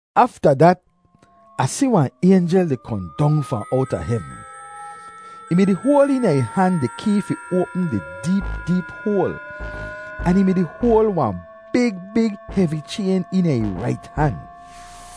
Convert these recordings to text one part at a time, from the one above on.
Afta dat, Ah si wahn aynjel di kohn dong fahn owta hevn. Ih mi-di hoal eena ih han di kee fi oapm di deep deep hoal, ahn ih mi-di hoal wahn big big hevi chayn eena ih rait han.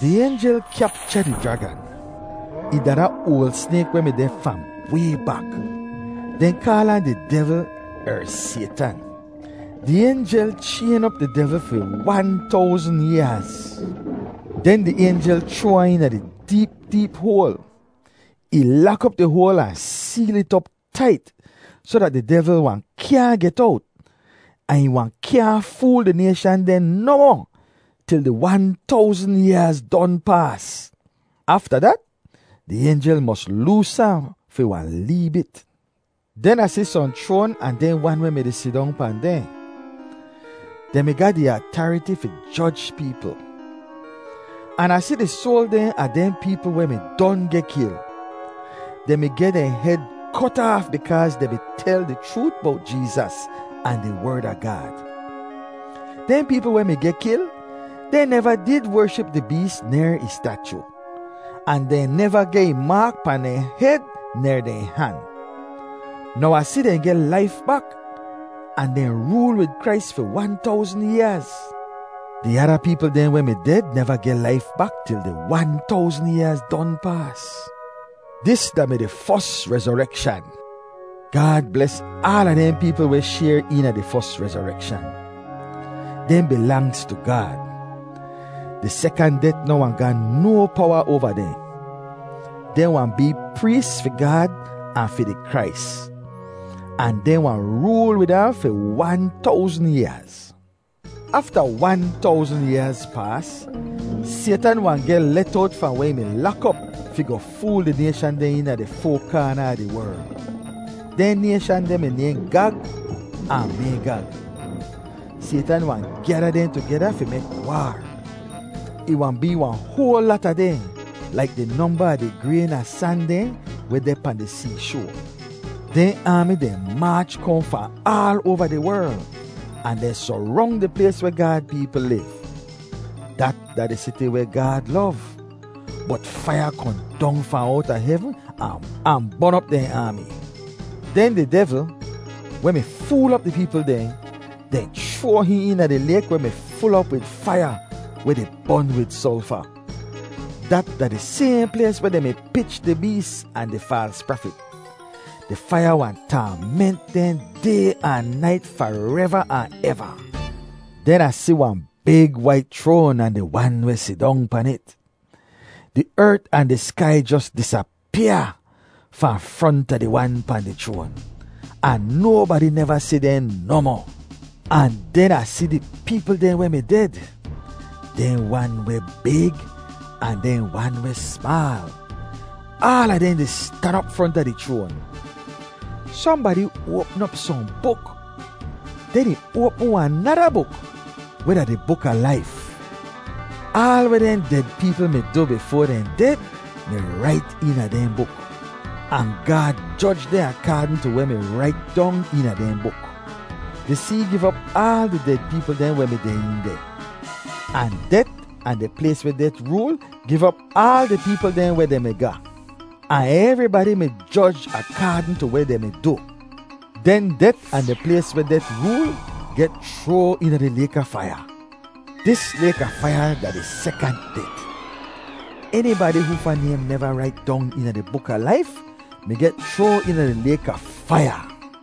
Di aynjel kyapcha di jragan. Ih da da oal snayk weh mi deh fahn way bak. Dehn kaal ahn di devl er Saytan. Di aynjel chayn op di devl fi wan towzn yaaz. Den di aynjel chroa ahn eena di deep deep hoal. Ih lak op di hoal ahn seel it op tait, soh dat di devl wahn kyaahn get owt, ahn ih wahn kyaahn fool di nayshan dehn nohmoh til di wan towzn yaaz don paas. Afta dat, di aynjel mos loos ahn fi wahn lee bit. Den Ah si sohn chroan ahn dehn wan weh mi-di sidong pahn dehn. Dehn mi ga di atariti fi joj peepl. An Ah si di soal dehn a dehn peepl weh mi don geh kil. Dehn mi geh dehn hed kot aaf bikaaz dehn mi tel di chroot bowt Jeezas ahn di Werd a Gaad. Dehn peepl weh mi geh kil, dehn neva did wership di bees ner ih stachu, ahn dehn neva geh ih maak pahn dehn hed ner dehn han. Now Ah si dehn geh laif bak ahn dehn rool wid Krais fi wan towzn yaaz. (Di ada peepl dehn weh mi ded neva geh laif bak til di wan towzn yaaz don paas.) Dis da-mi di fos rezorekshan. Gaad bles aala dehn peepl weh shayr eena di fos rezorekshan. Dehn bilangz tu Gaad. Di sekant det noh wahn ga no powa oava dehn. Dehn wahn bee prees fi Gaad ahn fi di Krais. Ahn dehn wahn rool wid ahn fi wan towzn yaaz. Afta wan towzn yaaz paas, Saytan wahn geh let owt fahn weh ih mi lak op fi goh fool di nayshan dehn eena di foa kaana a di werl. Dehn nayshan deh mi nayhn Gag ahn Maygag. Saytan wahn gyada dehn tugeda fi mek waar. Ih wahn bee wahn hoal lata dehn, laik di nomba a di grayn a san dehn weh deh pahn di seeshoa. Dehn aami dehn maach kohn fahn aal oava di werl, ahn dehn sorong di plays weh Gaad peepl liv. Dat da di siti weh Gaad lov. Bot faiya kohn dong fahn owta hevn ahn bon op dehn aami. Den di devl, weh mi fool op di peepl dehn, dehn chroa hihn eena di layk weh mi ful op wid faiya weh di bon wid solfa. Dat da di sayhn plays weh dehn mi pich di bees ahn di faals prafit. Di faiya wahn taament dehn day ahn nait fareva ahn eva. Den Ah si wahn big wait chroan ahn di Wan weh sidong pan it. Di ert ahn di skai jos disapyaa fahn fronta di Wan pahn di chroan, ahn nobadi neva si dehn nohmoh. Ahn den Ah si di peepl dehn weh mi ded, dehn wan weh big ahn dehn wan weh smaal, aala dehn di stan op fronta di chroan. Sohnbadi oapm op sohn buk. Den ih oapm wahn nada buk, weh da di buk a laif. Aal weh dehn ded peepl mi du bifoa dehn ded mi rait eena dehn buk. Ahn Gaad joj dehn akaadn tu weh mi rait dong eena dehn buk. Di see giv op aal di ded peepl dehn weh mi deh een deh. Ahn det ahn di plays weh det rool giv op aal di peepl dehn weh dehn mi ga. Ahn evribadi mi joj akaadn tu weh dehn mi du. Den det ahn di plays weh det rool geh chroa eena di layk a faiya. Dis layk a faiya da di sekant det. Enibadi hoofa naym neva rait dong eena di buk a laif mi geh chroa eena di layk a faiya.